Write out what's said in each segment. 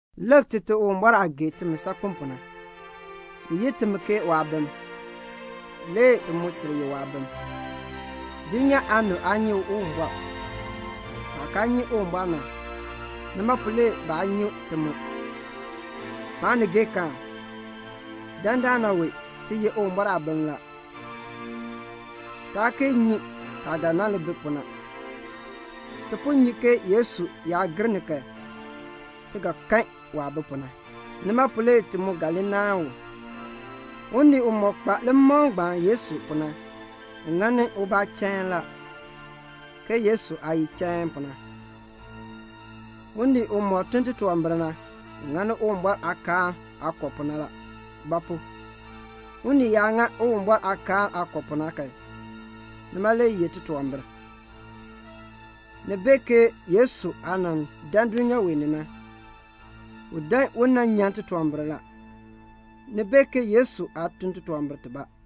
Lik Tite Uwumbɔr aah gee timi saakpen pu na. U yi timi ke waabim. Le ti mu sil ye waabim. Dulnyaa aanib aa nyi Uwumbɔr. Baah kaa nyi Uwumbɔr na, nima pu le baa nyi ti mu. Maanigeekaan, dandana wee ti ye Uwumbɔr aabim la. Taa kee nyi taah ga nan li bi pu na. Ti po nyi ke Yesu yaa gir ni kan, ti ga kan waah bi pu na. Nima pu le ti mu ga li naahn u. Unii umɔk kpa limakl ngbaan Yesu pu na, u ŋani ubaa chain la, ke Yesu aah ye chain pu na. Unii umɔk tun titunwambir na, u ŋani Uwumbɔr aakaal aah kɔ pu na la; ba pu? unii yaa ŋa Uwumbɔr aakaal aah kɔ pu na kan, nima le ye titunwambir. Ni bee ke Yesu aah nan dan dulnyaa wee ni na, u dan u nan nyan titunwambir la. Ni bee ke Yesu aa tun titunwambir tibaa.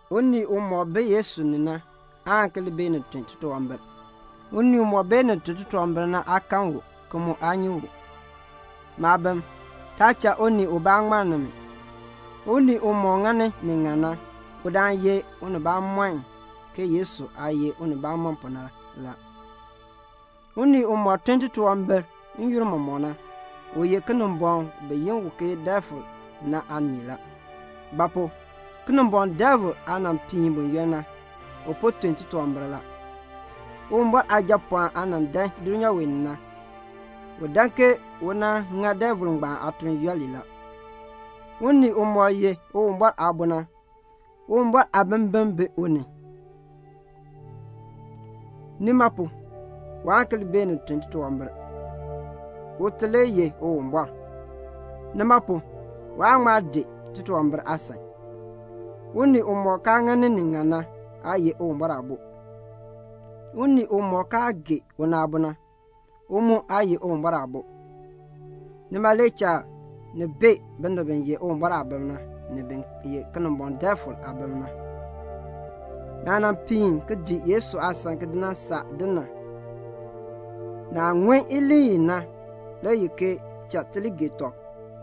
Unii umɔk bi Yesu ni na aan ki li beenin tun titunwambir. Unii umɔk beenin tun titunwambir na aa kan u, ki mu aa nyi u. Maabim, taa cha unii ubaa ŋmann nimi. Unii umɔk ŋani ni ŋan na, udaan ye unibamɔnn ke Yesu aah ye unibamɔnn pu na la. Unii umɔk tun titunwambir n-yoonn mɔmɔk na, u ye Kinimbɔŋ bi yi u ke Defil aanii la. Ba pu? Kinimbɔŋ Defil aah nan piin buyoonn na, u po tun titunwambir la. Uwumbɔr Aajapɔɔn aah nan dan dulnyaa wee ni na, u dan ke u nan ŋa Defil ngbaan aatuln yooli la. Unii umɔk ye Uwumbɔr aabo na, Uwumbɔr aabimbin bi u ni. Nima pu, waan ki li beenin tun titunwambir. Ute le ye Uwumbɔr. Nima pu, waan ŋma dii titunwambir aasan. Unii umɔk kaa ŋani ni ŋan na aa ye Uwumbɔr aabo. Unii umɔk kaa gee una aabo na, u mu aa ye Uwumbɔr aabo. Nima le cha ni bee binib bi ye Uwumbɔr aabim na, ni bin ye Kinimbɔŋ Defil aabim na. Naah nan piin ki dii Yesu aasan ki di nan saa din na, naah ŋun iliin i na le ye ke "Cha ti li gee tɔb."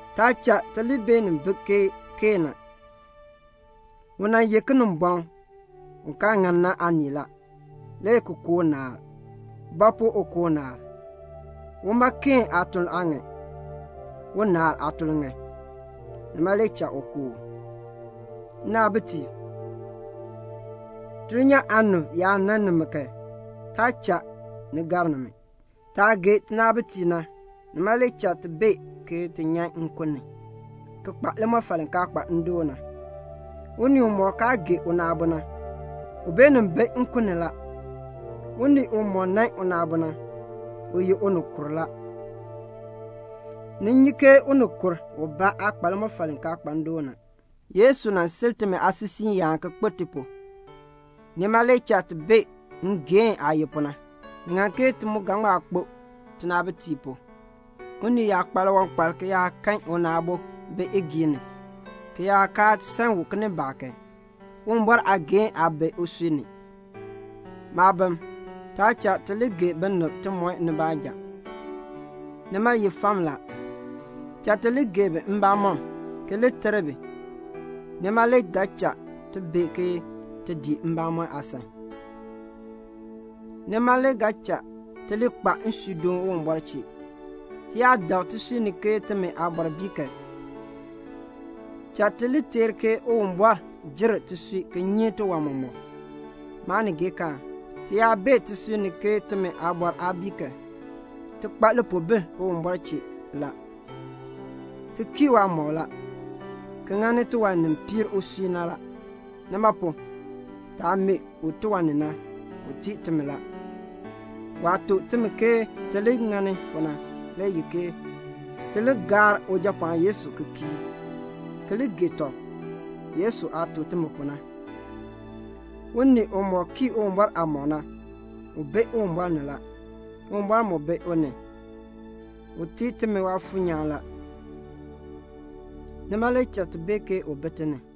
Taa cha ti li bi ke Keen na. U nan ye Kinimbɔŋ u kaa ŋan na aanii la, le ki ku unaal. Ba pu u ku unaal? Uma Keen aatuln aa ŋan. Unaal aatuln ŋan. Nima le cha u ku u. Nnaabitiib, dulnyaa aanib yaa nan nimi kan, taa cha ni gar nimi. Taah gee tinaabitiib na, nima le cha ti bee ke ti nyan nkun ni, ki kpa limɔfal li kaa kpa ndoon na. Unii umɔk kaa gee una aabo na, u beenin bi nkun ni la. Unii umɔk nan una aabo na ye unikur la. Ni nyi ke unikur ubaa aa kpa limɔfal li kaa kpa ndoon na. Yesu nan sil timi aasisiiyaan ki kpo ti pu. Nima le cha ti bee ngeehn aah ye pu na. Ni ŋan ke ti mu ga ŋma kpo tinaabitiib pu. Unii yaa kpa liwankpal ki yaa kan una aabo bi igiin ni ki yaa kaa san u kinimbaak kan, Uwumbɔr aageehn aa bi usui ni. Maabim, taa cha ti li gee binib timɔb ni baanja. Nima ye fam la. Cha ti li gee bi mbamɔm, ki li ter bi. Nima le ga cha ti bee ke ti dii mbamɔn aasan. Nima le ga cha ti li kpa nsuudoon Uwumbɔr chee. Ti yaa dak tisui ni ke timi aabɔr bii kan, cha ti li teer ke Uwumbɔr jer tisui ki nyi tiwan mɔmɔk. Maanigeekaan, ti yaa bee tisui ni ke timi aabɔr aa bii kan, ti kpa lipoobil Uwumbɔr chee la. Ti kii waamɔb la, ki ŋani tiwan ni piir usui na la. Nima pu, taah mee u tiwan ni na, u tii timi la. Waah tuk timi ke ti li ŋani pu na le ye ke: ti li gaar Ujapɔɔn Yesu Kristo ki kii, ki li gee tɔb, Yesu aah tuk timi pu na. Unii umɔk kii Uwumbɔr aamɔb na, u bi Uwumbɔr ni la. Uwumbɔr mu bi u ni la. U tii timi Waafuur nyaan la, nima le cha ti bee ke u bi ti ni.